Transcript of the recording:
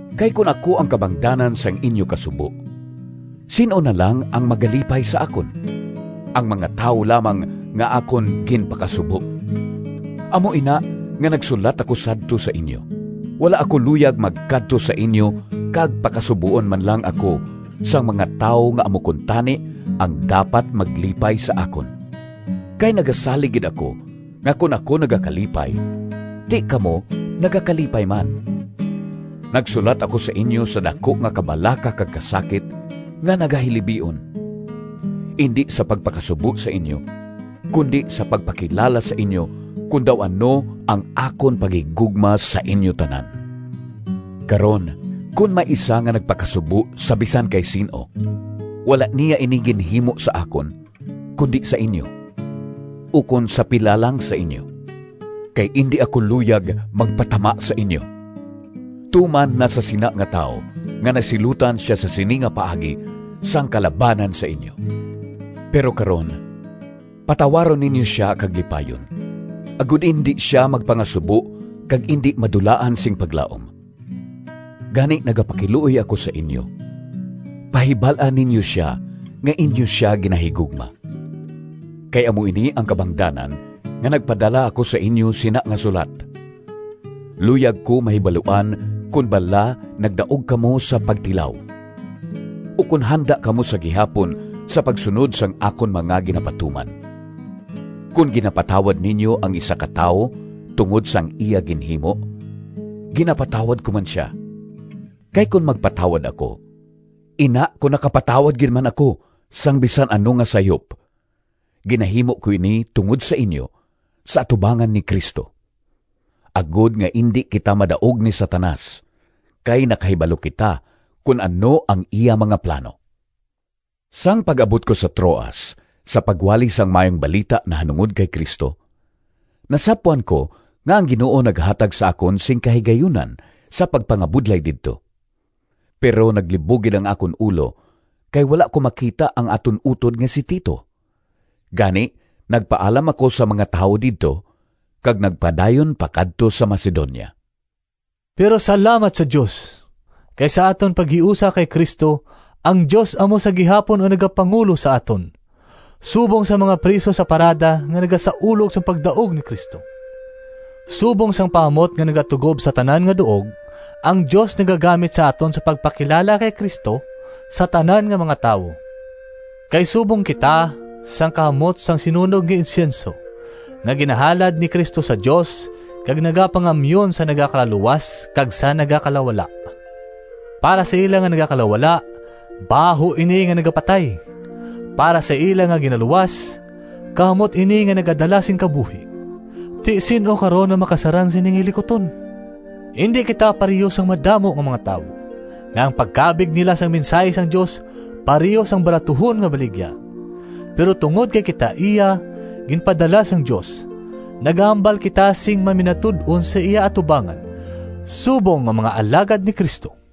Kay kon ako ang kabangdanan sang inyo kasubo, sin-o na lang ang magalipay sa akon? Ang mga tawo lamang nga akon ginpakasubo. Amo ina nga nagsulat ako sadto sa inyo. Wala ako luyag magkadto sa inyo kag pakasuboon man lang ako sang mga tawo nga amo kuntani ang dapat maglipay sa akon. Kay nagasalig gid ako nga kon ako nagakalipay, ti kamo nagakalipay man. Nagsulat ako sa inyo sa daku nga kabalaka kag kasakit, nga nagahilibion, indi sa pagpakasubo sa inyo, kundi sa pagpakilala sa inyo kon daw ano ang akon paghigugma sa inyo tanan. Karon, kon may isa nga nagpakasubo sa bisan kay sin-o, wala niya ini ginhimo sa akon, kundi sa inyo, ukon sa pila lang sa inyo, kay indi ako luyag magpatama sa inyo. Tuman na sa sina nga tawo nga nasilutan sia sa sini nga paagi sang kalabanan sa inyo. Pero karon, patawaron ninyo sia kag lipayon, agod indi sia magpangasubo kag indi madulaan sing paglaom. Gani, nagapakiluoy ako sa inyo, pahibal-a ninyo sia nga inyo sia ginahigugma. Kay amo ini ang kabangdanan nga nagpadala ako sa inyo sina nga sulat: luyag ko mahibaluan kon bala nagdaog kamo sa pagtilaw, ukon handa kamo sa gihapon sa pagsunod sang akon mga ginapatuman. Kon ginapatawad ninyo ang isa ka tawo tungod sang iya ginhimo, ginapatawad ko man sia. Kay kon magpatawad ako—ina kon nakapatawad gid man ako sang bisan ano nga sayop—ginahimo ko ini tungod sa inyo, sa atubangan ni Cristo, agod nga indi kita madaog ni Satanas, kay nakahibalo kita kon ano ang iya mga plano. Sang pag-abot ko sa Troas sa pagwali sang Maayong Balita nahanungod kay Cristo, nasapwan ko nga ang Ginoo naghatag sa akon sing kahigayunan sa pagpangabudlay didto. Pero naglibog gid ang akon ulo kay wala ko makita ang aton utod nga si Tito. Gani nagpaalam ako sa mga tawo didto, kag nagpadayon pakadto sa Macedonia. Pero salamat sa Dios! Kay sa aton paghiusa kay Cristo, ang Dios amo sa gihapon ang nagapangulo sa aton subong sang mga priso sa parada nga nagasaulog sang pagdaog ni Cristo. Subong sang pahamot nga nagatugob sa tanan nga duog, ang Dios nagagamit sa aton sa pagpakilala kay Cristo sa tanan nga mga tawo. Kay subong kita sang kahamot sang sinunog nga insyenso nga ginahalad ni Cristo sa Dios kag nagapangamyon sa nagakalaluwas kag sa nagakalawala. Para sa ila nga nagakalawala, baho ini nga nagapatay. Para sa ila nga ginaluwas, kahamot ini nga nagadala sing kabuhi. Ti sin-o karon, ang makasarang sini nga hilikuton? Indi kita pareho sang madamo nga mga tawo, nga ang pagkabig nila sang mensahi sang Dios pareho sang baratuhon nga baligya. Pero tungod kay kita iya ginpadala sang Dios, nagahambal kita sing maminatud-on sa iya atubangan subong nga mga alagad ni Cristo.